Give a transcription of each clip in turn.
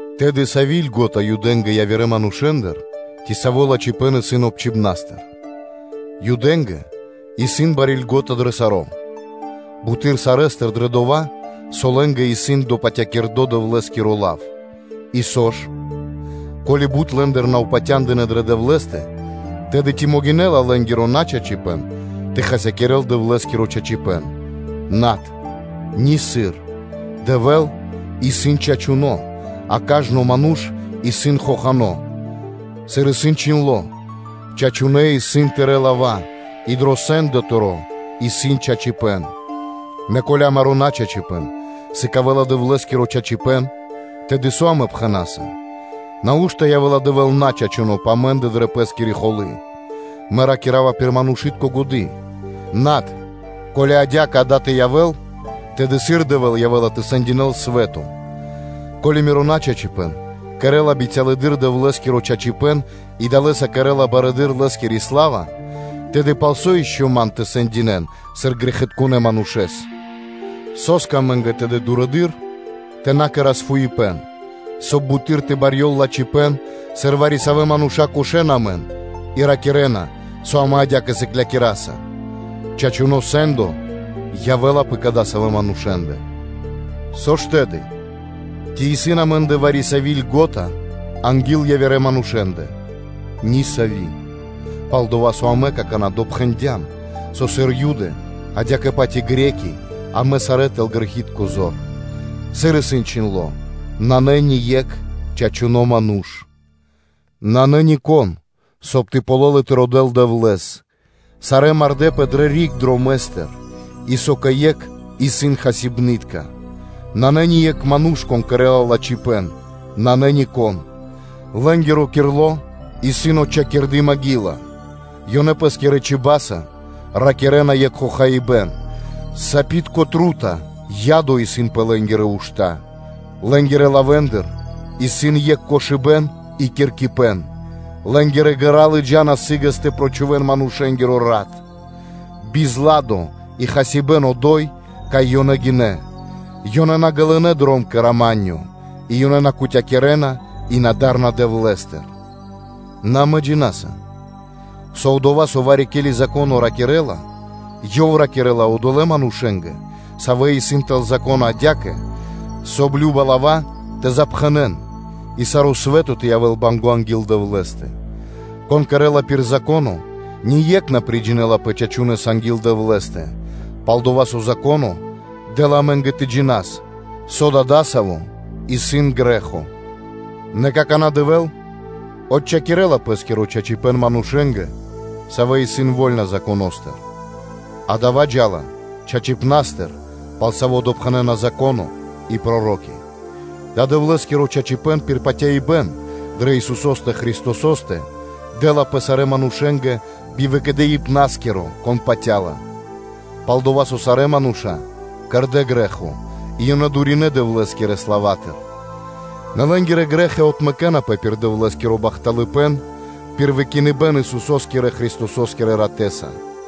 Тэды, сави́ льго́та (преимушчэство) исын Юдэ́ндэ явирэ манушэ́ндыр, ци саво́ лачхипэ́н исын обчхиныбнастыр? Юдэ́ндэ исын бари льго́та дро саро́: буты́р сарэ́стыр дрэ дова́, со лэ́нгэ сыс допатякирдо Дэвлэ́скиро лав. И со ж? Ко́ли бут лэ́ндыр на упатя́ндынэ дрэ Дэвлэ́стэ, тэды ци могинэ́ла лэ́нгиро начачипэ́н тэ хасякирэ́л Дэвлэ́скиро чачипэ́н? Над, нисыр. Дэвэ́л исын чачуно́, а кажно ману́ш исын хохано́, сыр исын чхиндло́: “Чачунэ́ исын Тырэ́ лава́, и дро сэ́ндо Тыро́ исын чачипэ́н.” Нэ ко́ли амаро́ начачипэ́н сыкавэ́ла Дэвлэ́скиро чачипэ́н, тэды со амэ пхэна́са? Нау́што явэ́ла Дэвэ́л начачуно пэ амэ́ндэ дрэ Пэ́скири холы́? Мэ ракира́ва пир манушы́тко годы́. Над, ко́ли адя́кэ дава́ тэ явэ́л, тэды сыр Дэвэ́л явэ́ла тэ сэндякирэ́л свэ́то? Ко́ли миро начачипэ́н кэрэ́ла бицялэдыр Дэвлэ́скиро чачипэ́н и далэ́са кэрэ́ла барэды́р Лэ́скири сла́ва, тэды пал со ишчо (инкэ́) ман тэ сэндинэ́н, сыр грэхитконэ́ манушэ́с? Со́скэ амэ́нгэ тэды дурэды́р тэ на кэра́с фуипэ́н, соб (кай) буты́р тэ барьёл лачхипэ́н, сыр вари-савэ́ мануша́ кошэна амэн и ракирэ́на, со амэ адя́кэ сыклякираса? Чачуно́ сэ́ндо явэ́ла пэ кадасавэ́ манушэ́ндэ. Со ж тэды? Ци исын амэ́ндэ вари-сави́ льго́та анги́л явирэ манушэ́ндэ? Нисави́; палдова́ со амэ какана́ допхэндям, со сыр Юды, адя́кэ-паць и Эли́ны (Гре́ки/Баламэ́), амэ сарэ́ сам тэл грэхи́тко зор: сыр и исын чхиндло́: “Нанэ ние́кх чачуно́ ману́ш; нанэ нико́н, соб (кай) тэ ґалёл и тэ родэ́л Дэвлэ́с. Сарэ́ мардэ́пэ дрэ риг дромэ́стыр, и со кэ екх исын хасибны́тка, нанэ ни екх ману́ш, кон кэрэ́ла лачхипэ́н; нанэ нико́н: лэ́нгиро кирло исын отчхакирды маґила, ёнэ пэ́скирэ чиба́са (чибьяса) ракирэ́на екх хохаибэ́н; сапитко трута (ядо) исын пэ лэ́нгирэ ушта́: лэ́нгирэ лавэ́ндыр исын екх кошыбэ́н и киркипэн; лэ́нгирэ ґэра́ лыджа́на сы́гэс тэ прочхувэн манушэ́нгиро рат; бизладо и хасибэ́н одо́й, кай ёнэ гинэ́, ёнэ на ґалынэ́ дром кэ рама́нё (миро). И ёнэ на кутякирэна и на дарна Дэвлэ́стыр.” Нэ амэ джина́са, со дова́, со вари-ке́ли Зако́но ракирэ́ла, ёв ракирэ́ла одолэ́ манушэ́нгэ, савэ́ исын тэл Зако́но адя́кэ, соб (кай) кажна лава́ тэ запхэнэн тэ ракирэ́н, и саро́ свэ́то тэ явэ́л банго́ анги́л Дэвлэ́стэ. Кон кэрэ́ла пир Зако́но, усае́кх ние́кх на приджинэлапэ чачунэса анги́л Дэвлэ́стэ, пал-дова́ со Зако́но дэ́ла амэ́нгэ тэ джинас, со да дасаво исын грэ́хо. Нэ какана́ Дэвэ́л отчхакирэла Пэ́скиро чачипэ́н манушэ́нгэ, савэ́ исын вольна Законо́стыр, а дава́ джа́ла чачипнастыр, пал саво́ допхэнэна Зако́но и Проро́ки; дава́ Дэвлэ́скиро чачипэ́н исын пир патяибэ́н дрэ Исусо́стэ Христосо́стэ, саво́ дэ́лапэ сарэ́ манушэ́нгэ би выкэдыибнаскиро, кон патя́ла. Пал-дова́ со сарэ́ мануша́ кэрдэ́ грэ́хо и ёнэ дуринэ Дэвлэ́скирэ славатыр. Нэ лэ́нгирэ грэ́хи отмэкэнапэ пир Дэвлэ́скиро бахталыпэ́н, пир выкиныбэ́н Исусо́скирэ Христосо́скирэ ратэ́са;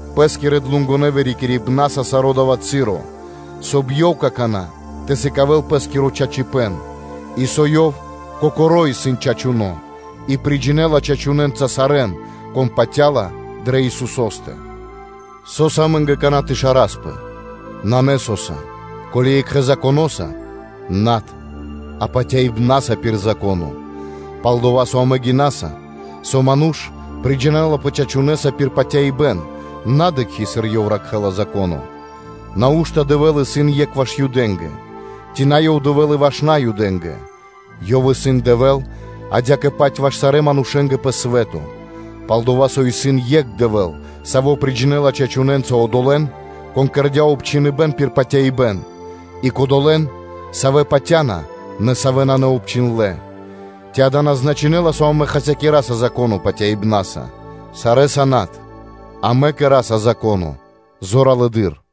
пэ́скирэ ґаратунэ́ (длугонэ) вырикирибнаса саро́ дава́ часо, соб (кай) Ёв какана́ тэ сыкавэ́л пэ́скиро чачипэ́н, и со Ёв кокоро́ исын чачуно́, и приджинэла чачунэнца сарэ́н, кон патя́ла дрэ Исусо́стэ. Со́са амэ́нгэ какана́ тэ шараспэ? Нанэ со́са. Ко́ли екхэ Законоса? Над, а патяибна́са пир Зако́но; пал-дова́ со амэ гинаса, со ману́ш приджинэлапэ чачунэса пир патяибэ́н, на дыкхи́, сыр ёв ракхэ́ла Зако́но. Нау́што Дэвэ́л исын екх ваш Юдэ́нгэ? Ци нанэ Ёв Дэвэ́л и Наюдэ́нгэ? Ёв исын Дэвэ́л адя́кэ-паць ваш сарэ́ манушэ́нгэ пэ свэ́то: пал-дова́ со исын екх Дэвэ́л, Саво́ приджинэла чачунэнца одолэ́н, кон кэрдя́ обчхиныбэн пир патяибэ́н и кодолэ́н, савэ́ патя́на, нэ савэ́ исын наобчиндлэ. Ци дава́ на значынэ́ла, со амэ хасякираса Зако́но патяибна́са? Сарэ́са над, амэ кэра́са Зако́но зоралэды́р.